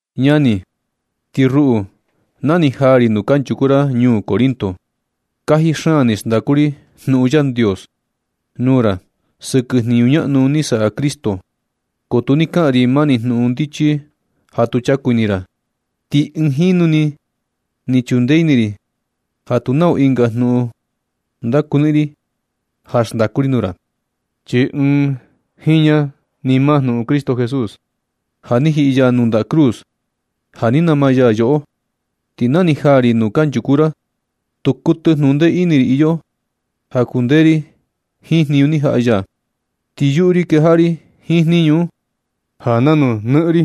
Ñani, ti ruꞌu, na ni jaa ri nuu kanchuku ra ñuu Corinto, kaji xaan ni xndaku ri jnuꞌun Yandios nuu ra sɨkɨ jniñu ñaꞌnu ni saꞌa Cristo, ko tu ni kaꞌan ri mani jnuꞌun ndichi ja tu chaku ini ra. Ti ɨɨn jinu ni ni chundee ini ri ja tu nau ɨnga jnuꞌun ndakuniꞌin ri ja xndaku ri nuu ra, chi ɨɨn jiña ni maa jnuꞌun Cristo Jesús ja ni jiꞌi ya nuu ndaꞌa cruz ja ni nama ya yoꞌo. Ti na ni jaa ri nuu kanchuku ra, tu kuɨtɨ jnuꞌun ndee ini ri iyo ja kundee ri jiin jniñu ni jaꞌa ya, ti yuꞌu ri kejaꞌa ri jiin jniñu un ja nanu nɨꞌɨn ri.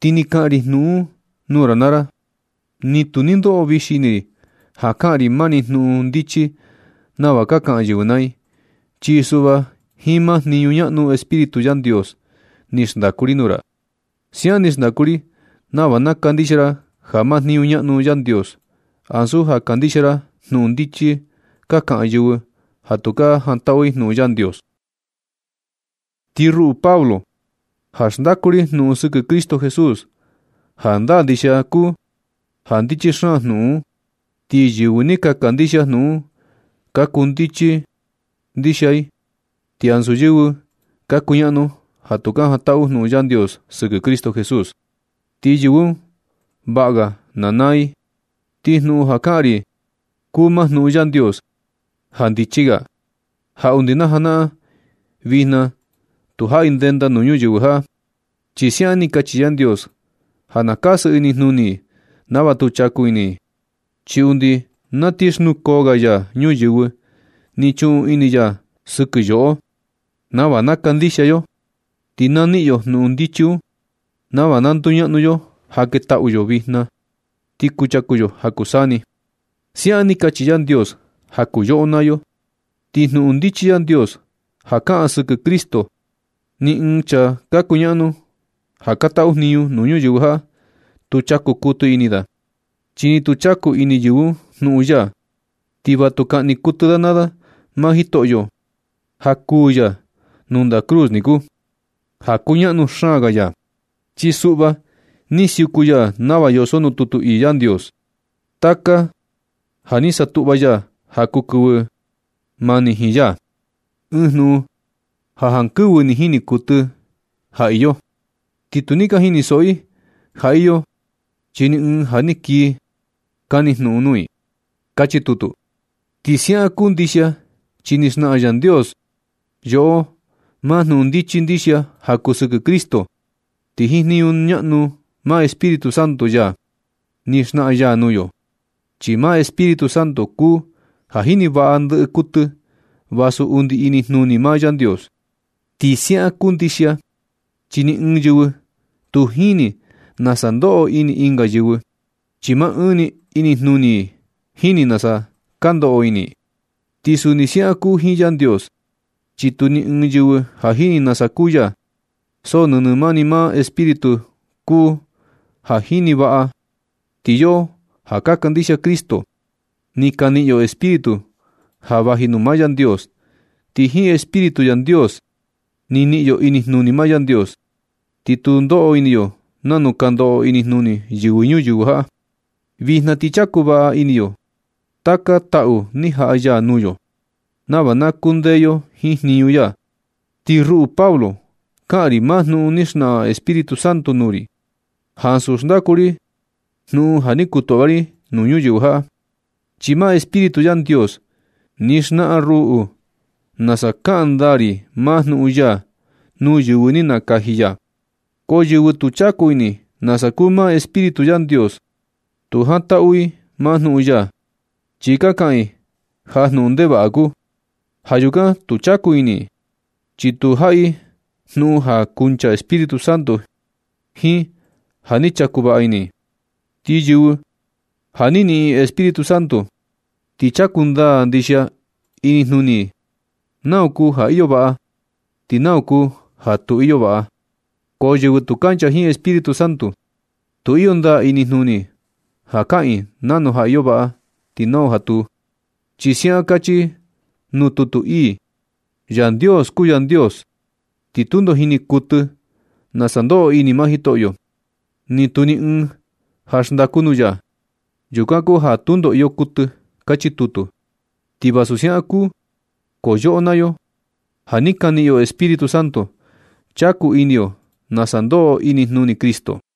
Ti na ni kaꞌan ri jnuꞌun un nuu ra naa ra, ni tu ni ndoꞌo vixi ini ri ja kaꞌan ri mani jnuꞌun ndichi nava ka kaꞌan yɨvɨ naa i. Chi suꞌva jiin maa jniñu ñaꞌnu Espíritu Yandios ni xndaku ri nuu ra. Siaꞌan ni xndaku ri nava na kandixia ra maa jniñu ñaꞌnu Yandios, ansu ja kandixia ra jnuꞌun ndichi ka kaꞌan yɨvɨ ja tu ka jantaꞌu i jnuꞌun Yandios. Ti ruꞌu Pablo, ja xndaku ri jnuꞌun sɨkɨ Cristo Jesús, jandaa ndixia kuu ja ndichi xaan jnuꞌun un. Ti yɨvɨ ni ka kandixia jnuꞌun un ka kuu ndichi ndixia i, ti ansu yɨvɨ ka kuñaꞌnu ja tu ka jantaꞌu jnuꞌun Yandios sɨkɨ Cristo Jesús. Ti yɨvɨ un vaꞌa ga na naa i. Ti jnuꞌun ja kaꞌan ri kuu maa jnuꞌun Yandios ja ndichi ga, ja undi na janaꞌan vijna tu jaꞌi ndenda nuu yɨvɨ ñuyɨvɨ, chi siaꞌan ni kachi Yandios ja na kasɨ inijnuni i nava tu chaku ini i. Chi undi na ti xnukoo ga ya ñuyɨvɨ, ni chuꞌun ini ya sɨkɨ yoꞌo nava na kandixia yo, ti na niꞌin yo jnuꞌun ndichi un nava na nduñaꞌnu yo ja ketaꞌu yo vijna, ti kuchaku yo ja kuu saa ni. Siaꞌan ni kachi Yandios ja kuu yoꞌo naa yo. Ti jnuꞌun ndichi Yandios ja kaꞌan sɨkɨ Cristo, ni ɨɨn chaa ka kuñaꞌnu ja ka taꞌu jniñu nuu ñuyɨvɨ jaꞌa, tu chaku kuɨtɨ ini da, chi nu ni chaku ini yɨvɨ un jnuꞌun ya, ti va tu kaꞌni kuɨtɨ da naa da maa Jitoꞌyo ja kuu ya nuu ndaꞌa cruz niku, ja kuñaꞌnu xaan ga ya. Chi suꞌva ni siuku ya nava yoso nuu tutu ii Yandios: Taka ja ni satuꞌva ya ja kuu yɨvɨ mani jiin ya. Ɨɨn jnuꞌun ja jankɨvɨ ni jini kuɨtɨ i ja iyo. Ti ni tu ni ka jinisoꞌo i ja iyo, chi ni ɨɨn ja ni kii kani jnuꞌun nuu i. Kachi tutu. Ti siaꞌan kuu ndixia chi ni xnaꞌan Yandios yoꞌo maa jnuꞌun ndichi ndixia ja kuu sɨkɨ Cristo. Ti jiin jniñu ñaꞌnu maa Espíritu Santo ya, ni xnaꞌan ya nuu yo, chi maa Espíritu Santo kuu ja jini vaꞌa ndɨꞌɨ kuɨtɨ, vasu undi inijnuni maa Yandios. Ti siaꞌan kuu ndixia chi ni ɨɨn yɨvɨ tu jini nasa ndoꞌo ini ɨnga yɨvɨ, chi maa ɨɨn ni inijnuni i jini nasa ka ndoꞌo ini i. Ti suni siaꞌan kuu jiin Yandios, chi tu ni ɨɨn yɨvɨ ja jini nasa kuu ya, so nɨnɨ mani maa Espíritu kuu ja jini vaꞌa. Ti yoꞌo ja ka kandixia Cristo, ni ka niꞌin yo Espíritu ja vaji nuu maa Yandios, ti jiin Espíritu Yandios ni niꞌin yo inijnuni maa Yandios, ti tu ndoꞌo ini yo nanu ka ndoꞌo inijnuni yɨvɨ ñuyɨvɨ jaꞌa. Vijna ti chaku vaꞌa ini yo taka taꞌu ni jaꞌa ya nuu yo, nava na kundee yo jiin jniñu ya. Ti ruꞌu Pablo kaꞌan ri maa jnuꞌun ni xnaꞌan Espíritu Santo nuu ri, ansu xndaku ri jnuꞌun ja ni kutuꞌva ri nuu yɨvɨ ñuyɨvɨ, chi maa Espíritu Yandios ni xnaꞌan ruꞌu nasa kaꞌan ndaa ri maa jnuꞌun ya nuu yɨvɨ ni nakaji ya. Ko yɨvɨ tu chaku ini nasa kuu maa Espíritu Yandios, tu jantaꞌu i maa jnuꞌun ya, chi ka kaꞌan i ja jnuꞌun ndevaꞌa kuu. Ja yukan tu chaku ini i, chi tu jaꞌa i jnuꞌun ja kuncha Espíritu Santo, jiin ja ni chaku vaꞌa ini i. Ti yɨvɨ ja ni niꞌin Espíritu Santo, ti chaku ndaa ndixia ini jnuni i nau kuu ja iyo vaꞌa ti nau kuu ja tu iyo vaꞌa. Ko yɨvɨ tu kancha jiin Espíritu Santo tu iyo ndaa inijnuni i ja kaꞌan i nau ja iyo vaꞌa ti nau ja tu. Chi siaꞌan kachi nuu tutu ii: “Yandios kuu Yandios, ti tundo jini kuɨtɨ nasa ndoꞌo ini maa Jitoꞌyo. Ni tu ni ɨɨn ja xndaku nuu ya. Yukan kuu ja tundo iyo kuɨtɨ.” Kachi tutu. Ti vasu siaꞌan kuu, ko yoꞌo naa yo ja ni ka niꞌin yo Espíritu Santo, chaku ini yo nasa ndoꞌo ini inijnuni Cristo.